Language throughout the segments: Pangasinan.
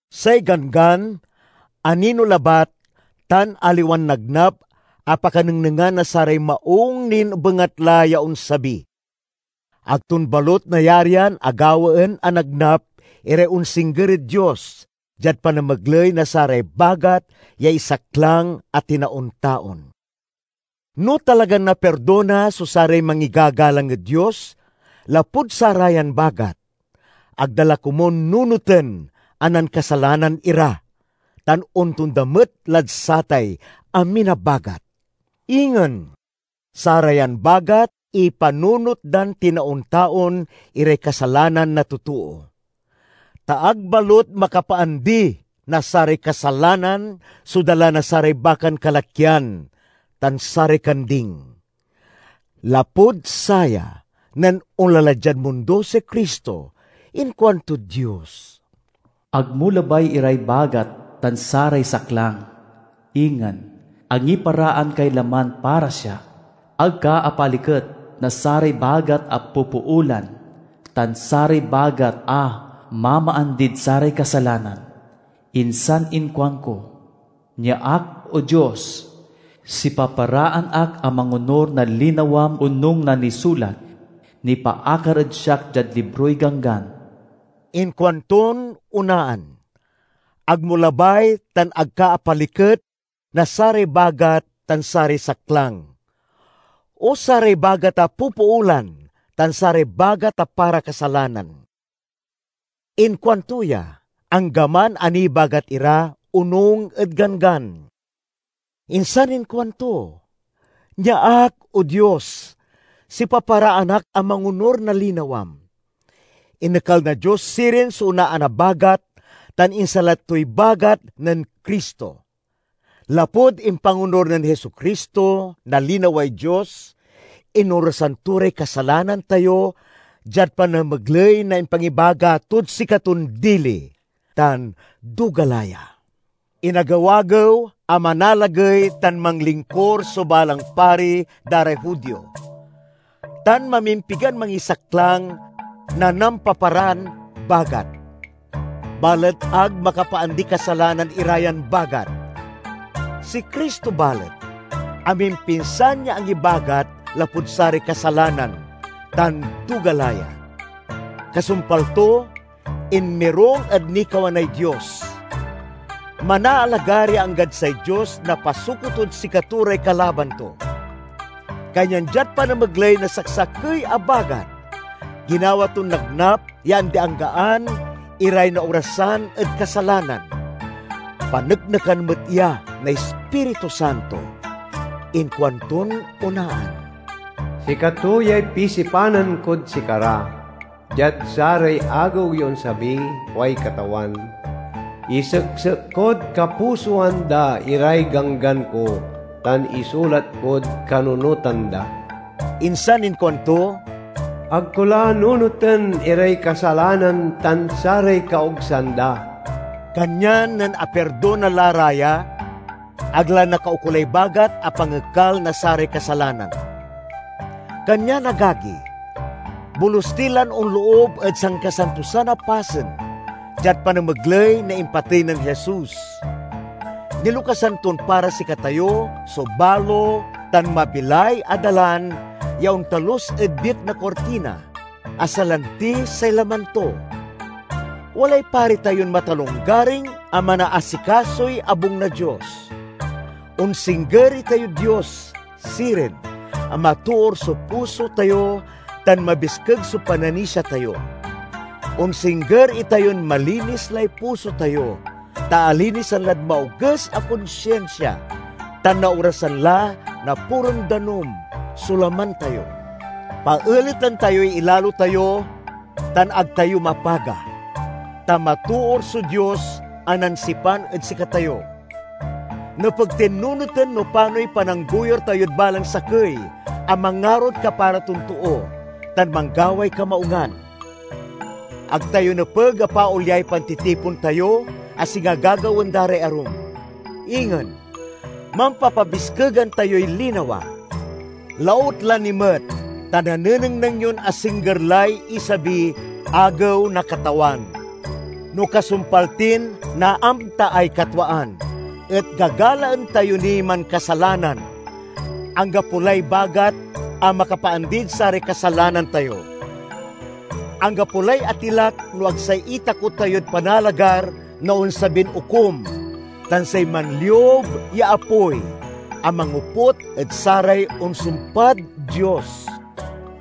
Say Ganggan anino labat tan aliwan nagnap a pakanengnengan na saray maung nin bengatla ya onsabi. Ag ton balut nayarian a gawaen a nagnap iray onsingger ed Dios diad panamegley na saray bagat ya isaklang a tinaon-taon. No talagan napirdona so saray mangigagalang ed Dios lapud sarayan bagat, ag da la komun nunoten a nankasalanan ira, tan ontonda met lad satay amin a bagat. Ingen, sarayan bagat ipanunot dan tinaon-taon iray kasalanan na totoo. Ta ag balut makapaandi na saray kasalanan so dala na saray bakan kalakyan tan saray kanding. Lapud saya, nen onla la diad mundo si Cristo, inkuantod Dios: "Ag mo labay iray bagat tan saray saklang, ingen, angiparaan kay laman para siak. Ag ka apaliket na saray bagat a popoolan, tan saray bagat a mamaandid saray kasalanan. Insan inkuanko, 'Nia ak, O Dios! Sipaparaan ak a mangonur na linawam onung na nisulat nipaakar ed siak diad libroy Ganggan.'" Inkuanton onaan, "Ag mo labay tan ag ka apaliket na saray bagat tan saray saklang, o saray bagat a popoolan tan saray bagat a para kasalanan." Inkuanto ya, anggaman a nibagat ira onung ed Ganggan. Insan inkuanto, "Nia ak, O Dios! Sipaparaan ak a mangonur na linawam." Inekal na Dios sirin so onaan a bagat tan insalat toy bagat nen Cristo. Lapud impangonur nen Jesu-Cristo na linaway Dios, inorasan to ray kasalanan tayo diad panamegley na impangibagat tod sikaton dili, tan duga la ya. Inagew-agew a manalagey tan manlingkur so balang pari da ray Judio, tan mamimpigan mangisaklang na nampaparan bagat. Balet ag makapaandiy kasalanan ira yan bagat. Si Cristo, balet, amimpinsan ya angibagat lapud saray kasalanan, tan duga la ya. Kasumpal to, inmirung ed nikawanay Dios. Manaalagar ya anggad say Dios napasuko tod sikato ray kalaban to. Kanyan diad panamegley na saksakey a bagat, ginawa ton nagnap ya andi-anggaan iray naorasan ed kasalanan. Paneknekan met ya na Ispiritu Santo. Inkuanton onaan, "Sikato yay pisipanan kod sikara, diad saray agew ya onsabi, kuay Katawan: Iseksek kod kapusoan da iray ganggan ko, tan isulat kod kanunotan da." Insan inkuanto, "Ag ko la nunoten iray kasalanan tan saray kaogsan da." Kanyan nen apirdona la ra ya, ag la nakaukolay bagat a pangekal na saray kasalanan. Kanyan, agagi, bolus ti lan onloob ed Sankasantosan a Pasen diad panamegley na impatey nen Jesus. Nilokasan ton para sikatayo so balo tan mabilay a dalan ya ontalus ed biek na kurtina, a salanti say laman to. Walay pari tayon matalonggaring a manaasikasoy abung na Dios. Onsingger itayod Dios, sirin, a matoor so puso tayo tan mabiskeg so pananisia tayo. Onsingger itayon malinis lay puso tayo ta alinisan lad maoges a konsinsia, tan naorasan la na puron danum so laman tayo. Paeleten tayoy ilalo tayo tan ag tayo mapaga, ta matoor so Dios a nansipan ed sikatayo. Nepeg tin nunoten no panoy pananggoyur tayod balang sakey a mangarod kapara ton too tan manggaway kamaungan. Ag tayo nepeg a paolyay pantitipon tayo, a singa gagawaen da ray arum. Ingen, mampapabiskegan tayoy linawa, lautla ni met ta nanenengneng yon asingger lay isabiy Agew na Katawan. No kasumpal tin naamtaay katwaan et gagalaen tayo niy mankasalanan, anggapo lay bagat a makapaandid saray kasalanan tayo. Anggapo lay atilak no ag say itakot tayod panalagar na onsabin Okum tan say manliub ya apoy a mangoput ed saray onsumpad Dios!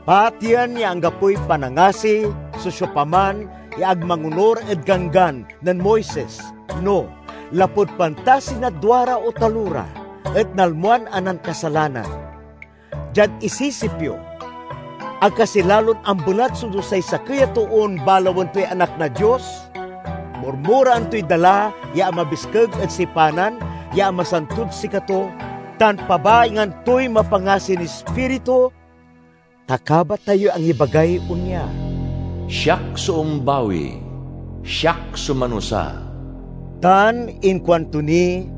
Pateyen ya anggapoy panangasi so siopaman ya ag mangonur ed Ganggan nen Moises no, lapud pantasi na duara o talora, et nalmoan a nankasalanan. Diad isisip yo, ag kasi lalon ambelat so dusay sakey a toon balawen toy Anak na Dios, murmuraen toy dala ya amabiskeg ed sipanan ya amasantod sikato, tan pabaingan toy mapangasin Ispiritu? Ta kabat tayoy angibagay onya: "Siak so ombawi; siak so manusa." Tan inkuanto ni,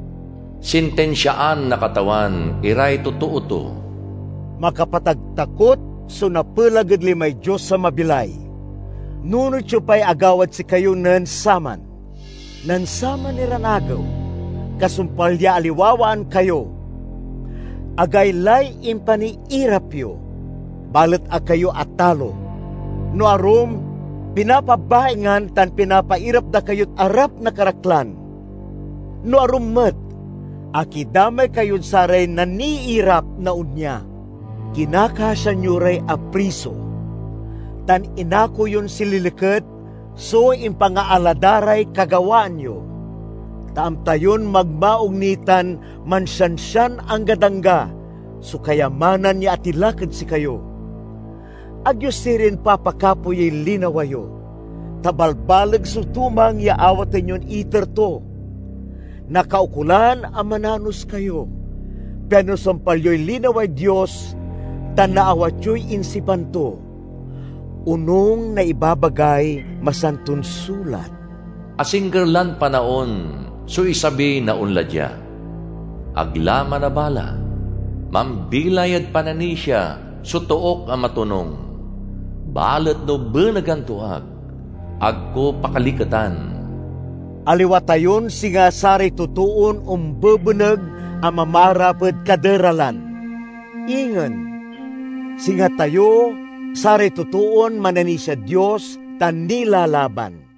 "Sintinsiaan na Katawan iray totoo to." Makapataktakot so napelag ed limay Dios a mabilay! Nunot yo pay agawad sikayo nen saman. Nen saman iran agew, kasumpal ya aliwawaan kayo, agaylay impaniirap yo, balet ag kayo atalo. No arum, pinapabaingan tan pinapairap da kayod arap na karaklan; no arum met, akidamay kayod saray naniirap na onya. Kinakasian yo ray apriso, tan inako yon sililiket so impangaala da ray kagawaan yo, ta amta yon magmaung ni tan mansiansian anggad angga so kayamanan ya atilak ed sikayo. Ag yo sirin papakapoyey linawa yo, ta balbaleg so tumang ya awaten yon iter to. Nakaukolan a mananos kayo, pian nasumpal yoy linaway Dios tan naawat yoy insipan to. Onung na ibabagay Masanton Sulat, "Asingger lan panaon so isabi na onla dia; ag la manabala. Mambilay ed pananisia so took a matonung, balet no benegan to ak, ag ko pakaliketan." Aliwa tayon singa saray totoon ombebeneg a mamaarap ed kaderalan. Ingen, singa tayo saray totoon mananisiad Dios tan nilalaban.